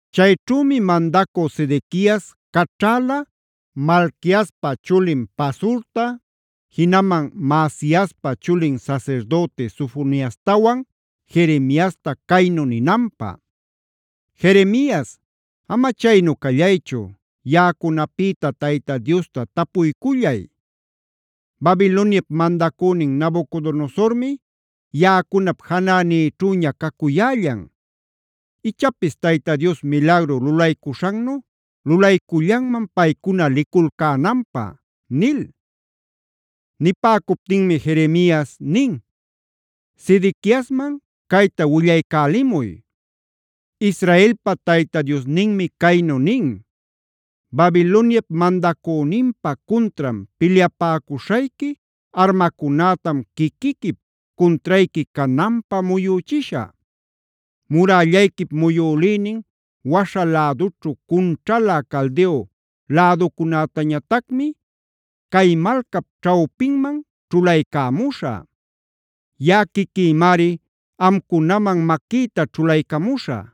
Chayćhümi mandacü Sedequias caćhäla Malquiaspa chulin Pasurta, jinaman Maasiaspa chulin sasirdüti Sofoniastawan Jeremiasta caynu ninanpä: “Jeremias, ama chaynu callaychu, yaꞌacunapïta Tayta Diosta tapuycullay. Babiloniap mandacünin Nabucodonosormi yaꞌacunap janänïćhüña cacuyällan.a Ichapis Tayta Dios milagru lulaycuśhannu lulaycullanman paycuna liculcänanpä” nil. Nipäcuptinmi Jeremias nin: “Sedequiasman cayta willaycälimuy: ‘Israelpa Tayta Diosninmi caynu nin: Babiloniap mandacüninpa cuntran pilyapäcuśhayqui armacunätam quiquiquip cuntrayqui cananpä muyüchishä. Murällayquip muyülïnin waśha lädućhu cunćhalä Caldeo läducunätañatacmi cay malcap ćhawpinman ćhulaycämuśhä. Yaꞌa quiquïmari amcunaman maquïta ćhulaycamuśhä.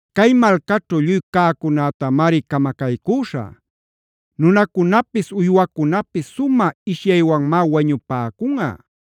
Cay malcaćhu lluy cäcunätamari camacaycüśhä; nunacunapis uywacunapis sumä ishyaywanmá wañupäcunꞌa.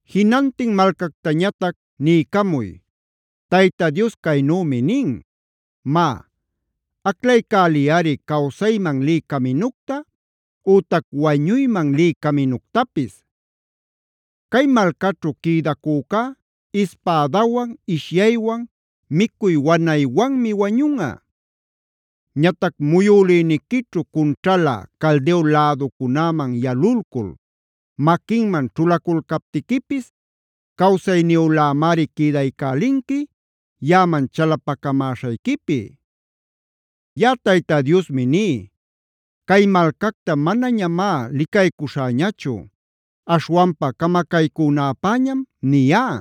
“Jinantin malcactañatac niycamuy: Tayta Dios caynümi nin: ‘Má, aclaycäliyꞌari cawsayman lï caminucta ütac wañuyman lï caminuctapis. Cay malcaćhu quïdacücá ispädawan, ishyaywan, micuy wanaywanmi wañunꞌa. Ñatac muyülïniquićhu cunćhalä Caldeo läducunäman yalulcul maquinman ćhulaculcaptiquipis cawsayniyülämari quïdaycälinqui yaꞌaman chalapacamäśhayquipi.c Yaꞌa Tayta Diosmi ní: Cay malcacta manañamá licaycuśhäñachu, aśhwanpa camacaycünäpäñam niyá.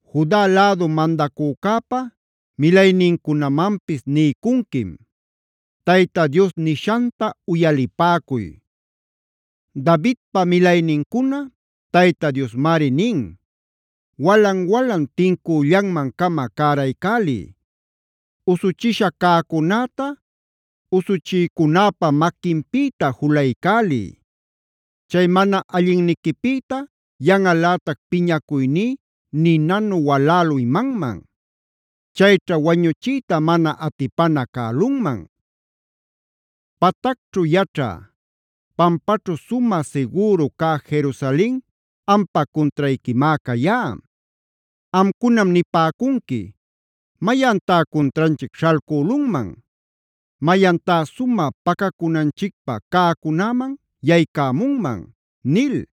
“Juda lädu mandacücäpa milaynincunamanpis niycunquim: “ ‘Tayta Dios nishanta uyalipäcuy: Davidpa milaynincuna, Tayta Diosmari nin: Walan-walan tincüllanman-cama cäraycäliy. Usuchisha cäcunäta usuchïcunäpa maquinpïta julaycäliy. Chay mana allinniquipïta yanꞌalätac piñacuyní ninanu walälü imanman. Chayćha wañuchiyta mana atipana cälunman. “ ‘Patacćhu yaćhä, pampaćhu sumä sigüru cä Jerusalen ampa cuntrayquimá cayá. Amcunam nipäcunqui: “¿Mayantá cuntranchic śhalcülunman? ¿Mayantá sumä pacacunanchicpä cäcunäman yaycämunman?” nil.